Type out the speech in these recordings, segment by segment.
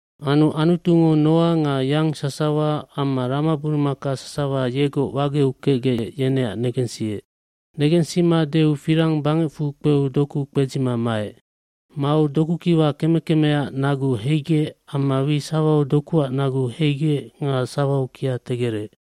Anu Anutungo Noa nga yang sasawa amma ramaburumaka sasawa yegoc wageu kecgec yeneac negensiec. Negensima deu firang bangecfu kpeu doku kpedzima maec. aMau dokukiwa keme kemeaac nagu heigec amma wi sawau dokuac nagu heigec nga sawau kia tegerec.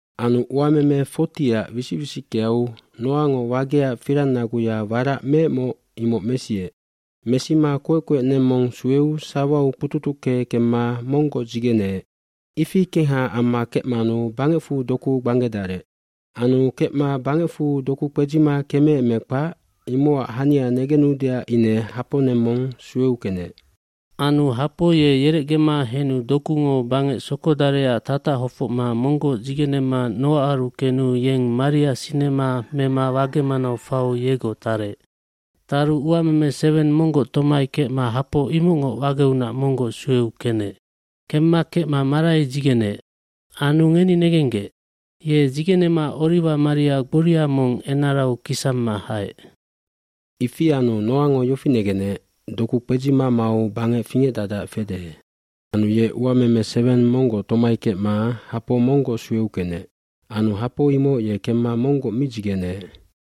Anu uememe 40ac wisic wisickeau Noango wageac firangnaguya warac meecmoc imoc mesiec. Mesima koec koec neng mong sueu sawau kpututucke kemma monggoc dzigeneec, ifi kengha amma kecmanu bangecfu doku gbanggedarec. Anu kecma bangecfu doku kpedzima kemeec me kpac, imocac hania negenudeac ine hapo neng mong sueu kenec. Anu hapo ye yerecgema henu dokungo bangec sokodarecac tatac hofocma monggoc dzigenema Noaaru kenu yeng maria sinema hapo mema wage manau fau yegoc tarec. Taru uameme seweng monggoc tomai kecma hapo imocngoc wageunac monggoc sueu kenec. Kemma kecma marai dzigeneec. Anu ngeni negenggec! Ye dzigenema oliwamaria gboria mong enarau kisamma haec. Ifi anu Noango yofi negenec doku kpedzima mau bangec fingecdacdac fede. Anu ye uameme seweng monggoc tomai kecma hapo monggoc sueu kenec. Anu hapo imoc ye kemma monggoc mi dzigeneec.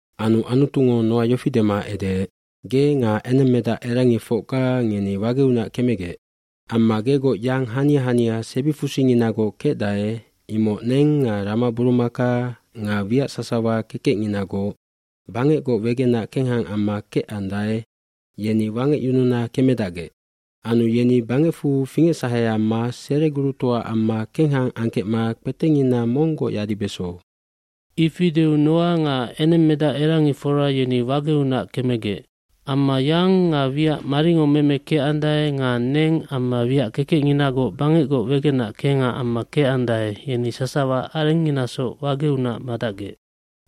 Anu Anutungo Noa yofi dema edeec, “Ge nga enengmedacerangifocga ngeni wageunac kemegec. bAmma gegoc yang hania hania sebifusinginagoc kecdae imoc neng nga ramaburumaka nga wiac sasawa kekecnginagoc bangecgoc wegenac kengha amma kecandae yeni wangecyununa kemedacgec. Anu yeni bangecfu fingecsahe amma seregurutoa amma kengha angkecma kpetecngina monggoc yadibeso.” Ifi deu Noa nga enengmedacerangifora yeni wageunac kemegec. Amma yang nga wiac maringo meme kecandae nga neng amma wiac kekecnginagoc bangecgoc wegenac kengha amma kecandae yeni sasawa arengnginasoc wageunac madacgec.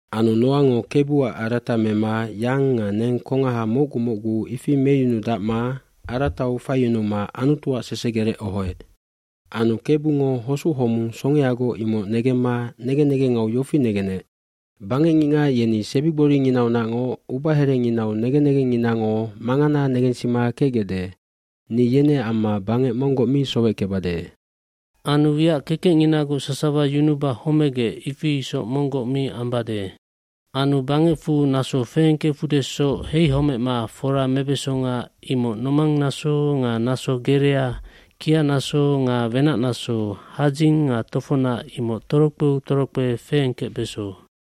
cAnu Noango Kebuac arata mema yang nga neng kongahamocgu mocgu ifi meyunudacma aratau faiyunuma Anutuacsesegerec ohoec. Anu Kebungo hosuc homung songeagoc imocnegemma negen negengau yofi negenec, “Bangecngicngac yenisebigboringinaunacngoc ubaherenginau negen negengnginangomangana negensima kecgecde. Ni yeneac amma bangec monggocmi soweckebade. Anu wiac kekecnginagoc sasawa yunuba homegecifi isoc monggoc mi ambade. Anu bangecfu naso feengkefudesocheihomecma fora mebesonga imoc nomangnaso nga naso gerea, kianaso nga wenacnaso, hadzing nga tofocnac imoc torokpeutorokpe feengkecbeso.”